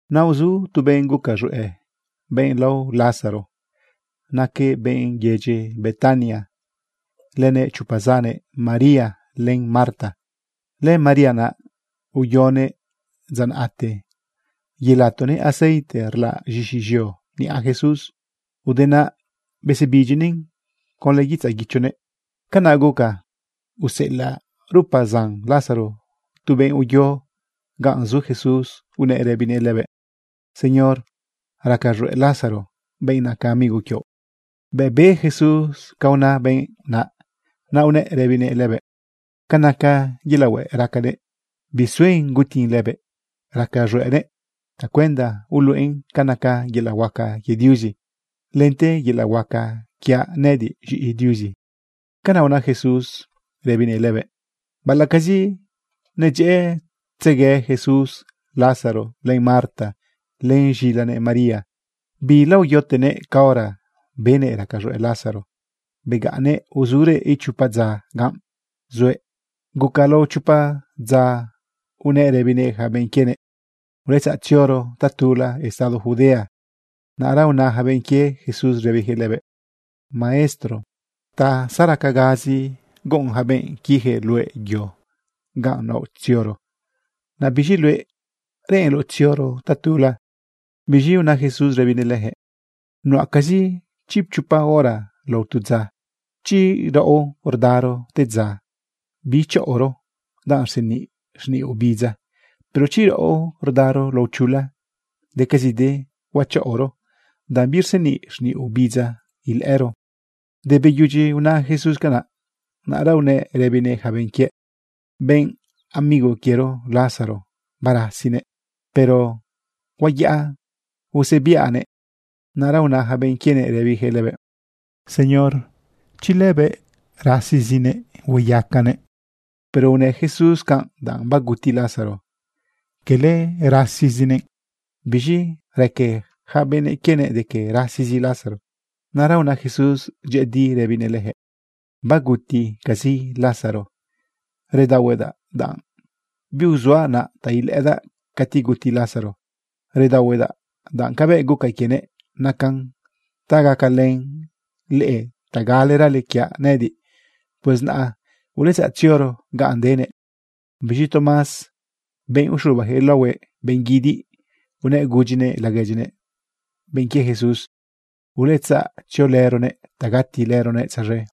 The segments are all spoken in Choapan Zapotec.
Naꞌ uzu tu benꞌ guca z̃hueꞌ, benꞌ lao Lázaro. Naquëꞌ benꞌ yedyi Betania lënëꞌ chopa zannëꞌ, María len Marta. LëMaría naꞌ uyonëꞌ dza naꞌte yelatonëꞌ aceite rlaꞌ z̃ixi z̃eo niꞌa Jesús. Ude naꞌ besebidyinëꞌn conlë guitzaꞌ guichonëꞌ. Canaꞌ guca useꞌelaꞌ rupa zan Lázaro tu benꞌ uyo ganꞌ zu Jesús unëꞌ rëbinëꞌ lëbëꞌ: ―Señor, raca z̃hueꞌ Lázaro, benꞌ naca amigo quioꞌ. Bëꞌ be Jesús ca una benꞌ naꞌ, naꞌ unëꞌ rëbinëꞌ lëbëꞌ: ―Ca naca yelaꞌ hueꞌ racanëꞌ, bisuen gutin lëbëꞌ. Raca z̃hueꞌnëꞌ tacuenda uluꞌen ca naca yelaꞌ huaca quie Diuzi, lente yelaꞌ huaca quiaꞌ nëꞌëdiꞌ z̃iꞌi Diuzi. ―Canaꞌ una Jesús rëbinëꞌ lëbëꞌ. Baꞌalaꞌcazi nedyëꞌëtzegue Jesús Lázaro len Marta len z̃ilanëꞌ María, bilaoyotenëꞌ caora benëꞌ raca z̃hueꞌ Lázaro. Begaꞌnnëꞌ uzurëꞌ ichopa dza ganꞌ zuëꞌ. Guca lao chopa dza unëꞌ rëbinëꞌ yaca benꞌ quienëꞌ: ―Uletzaꞌ tzioro tatula estado Judea. Naꞌra una yaca benꞌ quie Jesús rëbiyaquëꞌ lëbëꞌ: ―Maestro, ta zaracagazi guꞌun yaca benꞌ quiyaquëꞌ luëꞌ yo ganꞌ naoꞌ tzioro. Naꞌ biz̃i luëꞌ, ¿reꞌenloꞌ tzioro tatula? Biz̃i una Jesús rëbinëꞌ leyaquëꞌ: ―Nuꞌacazi chipchopa hora lao tu dza. Chi raꞌo rdaro te dza, bichaꞌoro danꞌ rseniꞌ xniꞌ obidza. Pero chi raꞌo rdaro lao chula, decazide huachaꞌoro, danꞌ birseniꞌ xniꞌ obidza ilëꞌëro. Te beyudyi una Jesús canaꞌ, naꞌra unëꞌ rëbinëꞌ yaca benꞌ quiëꞌ: ―Benꞌ amigo quiero Lázaro, barasinëꞌ, pero huayaꞌa usebiaꞌnëꞌ. Naꞌra una yaca benꞌ quienëꞌ rëbiyaquëꞌ lëbëꞌ: ―Señor, chi lëbëꞌ rasizinëꞌ, hueyacanëꞌ. Pero unë Jesús canꞌ danꞌ baguti Lázaro, cala rasizinëꞌ. Biz̃i raque yaca benꞌ quienëꞌ de que rasizi Lázaro. Naꞌra una Jesús dyëꞌëdi rëbinëꞌ leyaquëꞌ: ―Baguticazi Lázaro. Redaohuedaꞌ danꞌ biuzuaꞌ naꞌ ta ilëꞌëdaꞌ cati guti Lázaro. Redaohuedaꞌ danꞌ cabëꞌ guca quienëꞌ nacan ta gacalën leꞌe ta galerale quiaꞌ nëꞌëdiꞌ. Pues naꞌ uletzaꞌ tzioro ganꞌ denëꞌ. Biz̃i Tomás, benꞌ uxubayaquëꞌ laohue benꞌ guidiꞌ, unëꞌ gudyinëꞌ laguedyinëꞌ, benꞌ quie Jesús: ―Uletzaꞌ tziolëronëꞌ ta gatilëronëꞌ tzaz̃e.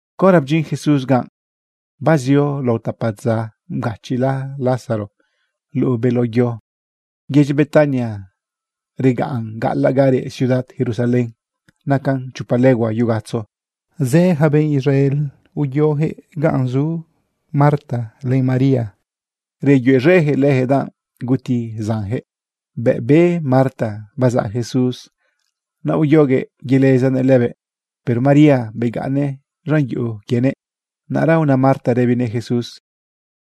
Caora bdyin Jesús ganꞌ, bazio lao tapa dza babgachiꞌla Lázaro luꞌu beló yo. Yedyi Betania regaꞌn gaꞌalaꞌ ga reꞌ ciudad Jerusalén. Nacan chopa legua yugatzo. Zë yaca benꞌ Israel uyoyaquëꞌ ganꞌ nitaꞌ Marta len María, reyuez̃eyaquëꞌ leyaquëꞌ danꞌ guti zanyaquëꞌ. Bëꞌ be Marta bazaꞌ Jesús, naꞌ uyoguëꞌ yelezanëꞌ lëbëꞌ. Pero María begaꞌnnëꞌ z̃an yuꞌu quienëꞌ. Naꞌra una Marta rëbinëꞌ Jesús: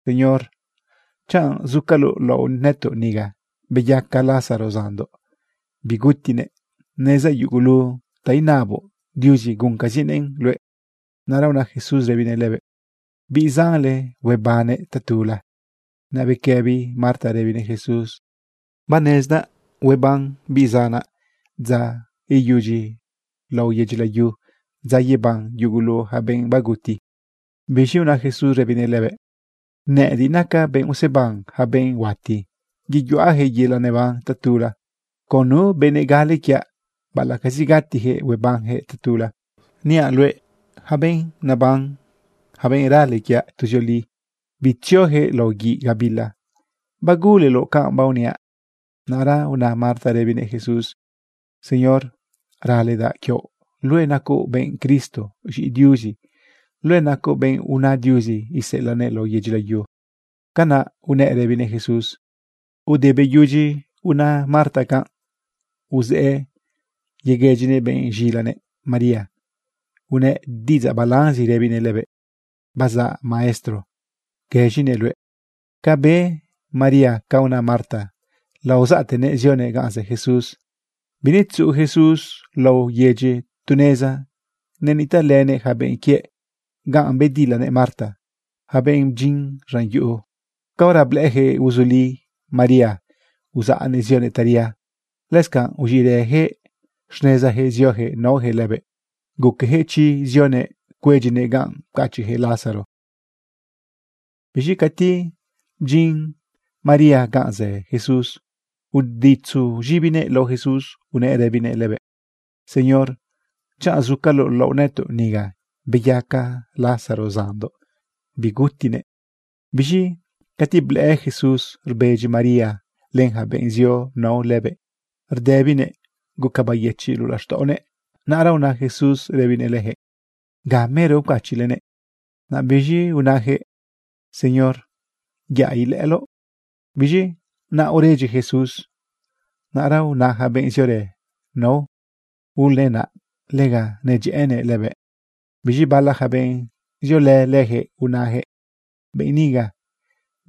―Señor, chanꞌ zucaloꞌ laoꞌ nëtoꞌ niga, beyaca Lázaro zanndoꞌ, bigutinëꞌ. Nezdaꞌ yugulu ta inaboꞌ Diuzi, guncazinëꞌn luëꞌ. Naꞌra una Jesús rëbinëꞌ lëbëꞌ: ―Biꞌ zanle huebannëꞌ tatula. Naꞌ bequëbi Marta rëbinëꞌ Jesús: ―Banezdaꞌ hueban biꞌ zanaꞌ dza iyudyi lao yedyi layu, dza yeban yugulu yaca benꞌ baguti. Biz̃i una Jesús rëbinëꞌ lëbëꞌ: ―Nëꞌëdiꞌ nacaꞌ benꞌ useban yaca benꞌ huati, yeyuꞌayaquëꞌ yelaꞌ neban tatula. Con nu benëꞌ gale quiaꞌ, baꞌalaꞌcazi gatiyaquëꞌ, huebanyaquëꞌ tatula. Niaꞌ luëꞌ yaca benꞌ neban, yaca benꞌ rale quiaꞌ, tuzioli bitziojëꞌ lao guiꞌ gabila. ¿Baguleloꞌ canꞌ baoniaꞌ? Naꞌra una Marta rëbinëꞌ Jesús: ―Señor, raledaꞌ quioꞌ luëꞌ nacoꞌ benꞌ Cristo, z̃iꞌi Diuzi. Luëꞌ nacoꞌ benꞌ una Diuzi iseꞌelaꞌnëꞌ lao yedyi layu. ―Canaꞌ unëꞌ rëbinëꞌ Jesús. Ude beyudyi una Marta canꞌ, uzëꞌë yeguëdyinëꞌ benꞌ z̃ilanëꞌ María. Unëꞌ diꞌidzaꞌ balanzi rëbinëꞌ lëbëꞌ: ―Bazaꞌ Maestro, guëz̃inëꞌ luëꞌ. Ca be María ca una Marta, laozaꞌtenëꞌ zionëꞌ ganꞌ zë Jesús. Binetzuꞌu Jesús laꞌo yedyi. Tu neza nenitaꞌlënëꞌ yaca benꞌ quiëꞌ ga bedilanëꞌ Marta. Yaca benꞌ bdyin z̃an yuꞌu, caora blëꞌëyaquëꞌ uzuli María uzaꞌnëꞌ zionëꞌ taria, lëscanꞌ uz̃iꞌrëyaquëꞌ xnezayaquëꞌ zioyaquëꞌ naoyaquëꞌ lëbëꞌ. Guqueyaquëꞌ chi zionëꞌ cuedyinëꞌ ganꞌ pcachiꞌyaquëꞌ Lázaro. Biz̃i cati bdyin María ganꞌ zë Jesús, uditzu z̃ibinëꞌ lao Jesús, unëꞌ rëbinëꞌ lëbëꞌ: ―Señor, chanꞌ zucaloꞌ laoꞌ nëtoꞌ niga, beyaca Lázaro zanndoꞌ, bigutinëꞌ. Biz̃i cati blëꞌë Jesús rbedyi María len yaca benꞌ zio nao lëbëꞌ, rdëbinëꞌ guca beyëchiꞌ luꞌu laxtaꞌonëꞌ. Naꞌra una Jesús rëbinëꞌ leyaquëꞌ: ―¿Ga mero pcachiꞌlenëꞌ? Naꞌ biz̃i unayaquëꞌ: ―Señor, yaꞌ ilëꞌëloꞌ. Biz̃i naꞌ uredyi Jesús. Naꞌra una yaca benꞌ ziorë nao: ―Ulenaꞌ, lega nedyëꞌënëꞌ lëbëꞌ. Biz̃i bala yaca benꞌ ziolë leyaquëꞌ unayaquëꞌ: ―Benꞌ niga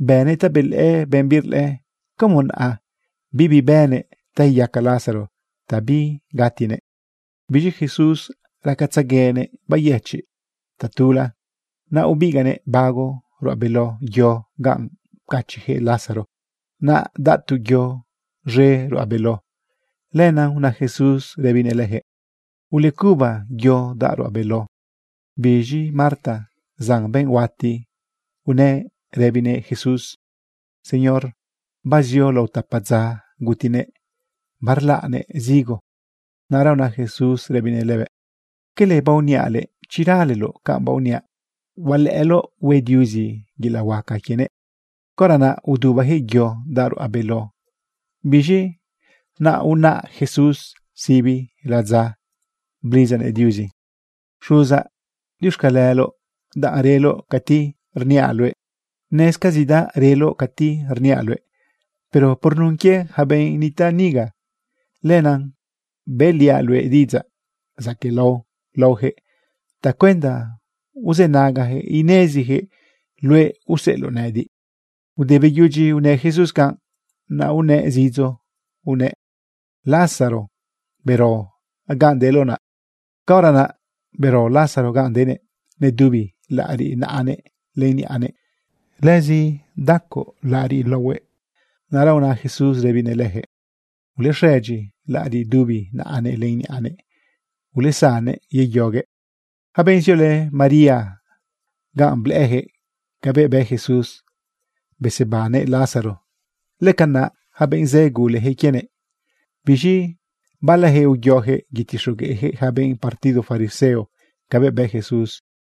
bënëꞌ ta belëꞌë benꞌ birlëꞌë, ¿cómo naꞌ bibi bënëꞌ ta iyaca Lázaro ta bigatinëꞌ? Biz̃i Jesús racatzeguenëꞌ beyëchiꞌ tatula. Naꞌ ubigaꞌnëꞌ bago ruꞌa beló yo ganꞌ pcachiꞌyaquëꞌ Lázaro. Naꞌ daꞌ tu yo z̃e ruꞌa beló. Lenaꞌ una Jesús rëbinëꞌ leyaquëꞌ: ―Ulecuba yo daꞌ ruꞌa beló. Biz̃i Marta, zan benꞌ huati, unëꞌ rëbinëꞌ Jesús: ―Señor, bazio lao tapa dza gutinëꞌ, barlaꞌnëꞌ zigo. Naꞌra una Jesús rëbinëꞌ lëbëꞌ: ―¿Cala baoniaꞌ luëꞌ, chi raleloꞌ canꞌ baoniaꞌ, hualëꞌëloꞌ hue Diuzi yelaꞌ huaca quienëꞌ? Caora naꞌ udubayaquëꞌ yo daꞌ ruꞌa beló. Biz̃i naꞌ unaꞌ Jesús sibi ladza, blidzanëꞌ Diuzi: ―Xuzaꞌ, diuxcaleloꞌ danꞌ reloꞌ cati niaꞌ luëꞌ. Nezcazidaꞌ reloꞌ cati rniaꞌ luëꞌ. Pero por nun quie yaca benꞌ nitaꞌ niga, lenaꞌ bëꞌliaꞌ luëꞌ diꞌidzaꞌ zaquëꞌlao laoyaquëꞌ tacuenda uzënagayaquëꞌ ineziyaquëꞌ luëꞌ useꞌeloꞌ nëꞌëdiꞌ. Ude beyudyi unë Jesús canꞌ, naꞌ unëꞌ zidzo unëꞌ: ―Lázaro, bero ganꞌ deloꞌ naꞌ. Caora naꞌ bero Lázaro ganꞌ denëꞌ. Nedubi laꞌariꞌ naꞌanëꞌ len niꞌanëꞌ. Lëzi bdaco laꞌariꞌ laohuëꞌ. Naꞌra una Jesús rëbinëꞌ leyaquëꞌ: ―Ulexëdyi laꞌariꞌ dubi naꞌanëꞌ len niꞌanëꞌ. Ulesannëꞌ yeyoguëꞌ. Yaca benꞌ ziolë María ganꞌ, blëꞌëyaquëꞌ cabëꞌ bë Jesús besebannëꞌ Lázaro. Lëcanaꞌ yaca benꞌ zë guleyaquëꞌ quienëꞌ. Biz̃i balayaquëꞌ uyoyaquëꞌ yetixogueꞌyaquëꞌ yaca benꞌ partido fariseo cabëꞌ bë Jesús.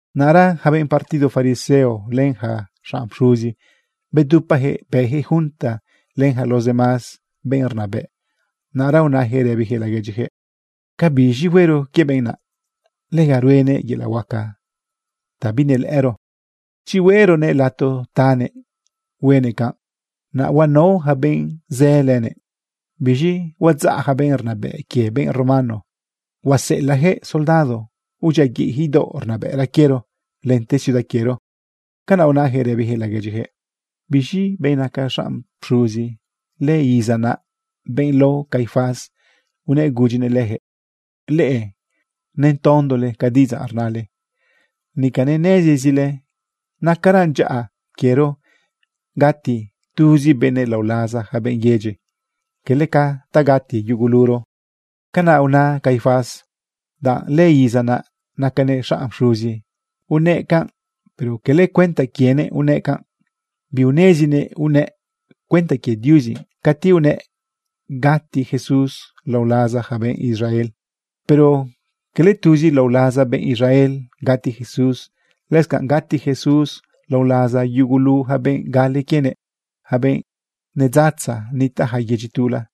Naꞌra yaca benꞌ partido fariseo len yaca xanꞌ pxuzi bedupayaquëꞌ bëyaquëꞌ junta len yaca los demás benꞌ rnabëꞌ. Naꞌra unayaquëꞌ rëbiyaquëꞌ laguedyiyaquëꞌ: ―¿Ca biz̃i huero quie benꞌ naꞌ? Lega ruenëꞌ yelaꞌ huaca ta binelëꞌëro. Chi hueꞌroguëꞌ lato tanëꞌ huenëꞌ canꞌ, naꞌ huanao yaca benꞌ zë lënëꞌ. Biz̃i huadzaꞌ yaca benꞌ rnabëꞌ quie benꞌ romano, huaseꞌelaꞌyaquëꞌ soldado udyiaguiꞌyaquëꞌ idaoꞌ rnabëꞌra quiero lente ciudad quiero. ―Canaꞌ unayaquëꞌ rëbiyaquëꞌ laguedyiyaquëꞌ. Biz̃i benꞌ naca xanꞌ pxuzi lëiza naꞌ, benꞌ lao Caifás, unëꞌ gudyinëꞌ leyaquëꞌ: ―Leꞌe netondole ca diꞌidzaꞌ rnale. Nica nenezile nacaran dyaꞌa quiero gati tuzi benëꞌ lao laza yaca benꞌ yedyi, cala ca ta gati yuguluro. ―Canaꞌ una Caifás. Danꞌ lëiza naꞌ nacanëꞌ xanꞌ pxuzi unëꞌ canꞌ. Pero cala cuenta quienëꞌ unëꞌ canꞌ. Biunezinëꞌ unëꞌ cuenta quie Diuzi cati unëꞌ gati Jesús lao laza yaca benꞌ Israel. Pero cala tuzi lao laza benꞌ Israel gati Jesús, lëscanꞌ gati Jesús lao laza yugulu yaca benꞌ gale quienëꞌ, yaca benꞌ nedzatza nitaꞌ yaca yedyi tula.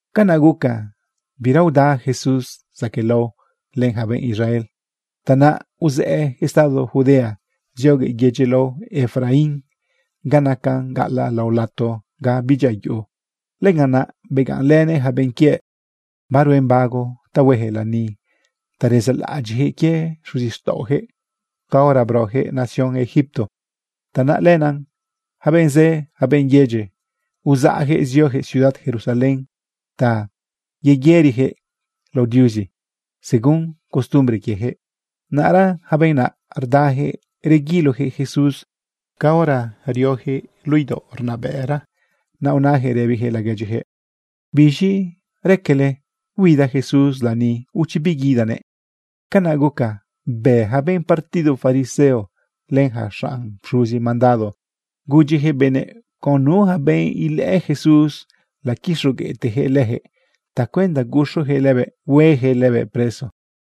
Canaꞌ guca bira uda Jesús zaquëꞌlao len yaca benꞌ Israel. Tanaꞌ uzëꞌë estado Judea zioguëꞌ yedyi lao Efraín ga nacan gaꞌalaꞌ lao lato ga bidyia yuꞌu. Lëganꞌ naꞌ begaꞌnlënëꞌ yaca benꞌ quiëꞌ. Baruen bago ta hueyaquëꞌ lani ta rezaꞌlaꞌadyiꞌyaquëꞌ quie xuzixtaꞌoyaquëꞌ caora broyaquëꞌ nación Egipto. Tanaꞌ lenaꞌ yaca benꞌ zë, yaca benꞌ yedyi, uzaꞌyaquëꞌ zioyaquëꞌ ciudad Jerusalén ta yeyëriyaquëꞌ cuinyaquëꞌ lao Diuzi según costumbre quieyaquëꞌ. Naꞌra yaca benꞌ naꞌ rdayaquëꞌ reguiloyaquëꞌ Jesús. Caora rioyaquëꞌ luꞌu idaoꞌ rnabëꞌra, naꞌ unayaquëꞌ rëbiyaquëꞌ laguedyiyaquëꞌ: ―¿Biz̃i raquele? ¿Huida Jesús lani, o chi biguidanëꞌ? Canaꞌ guca bë yaca benꞌ partido fariseo len yaca xanꞌ pxuzi mandado gudyiyaquëꞌ benëꞌ con nu yaca benꞌ ilëꞌë Jesús laquixogueꞌteyaquëꞌ leyaquëꞌ tacuenda guxuyaquëꞌ lëbëꞌ hueyaquëꞌ lëbëꞌ preso.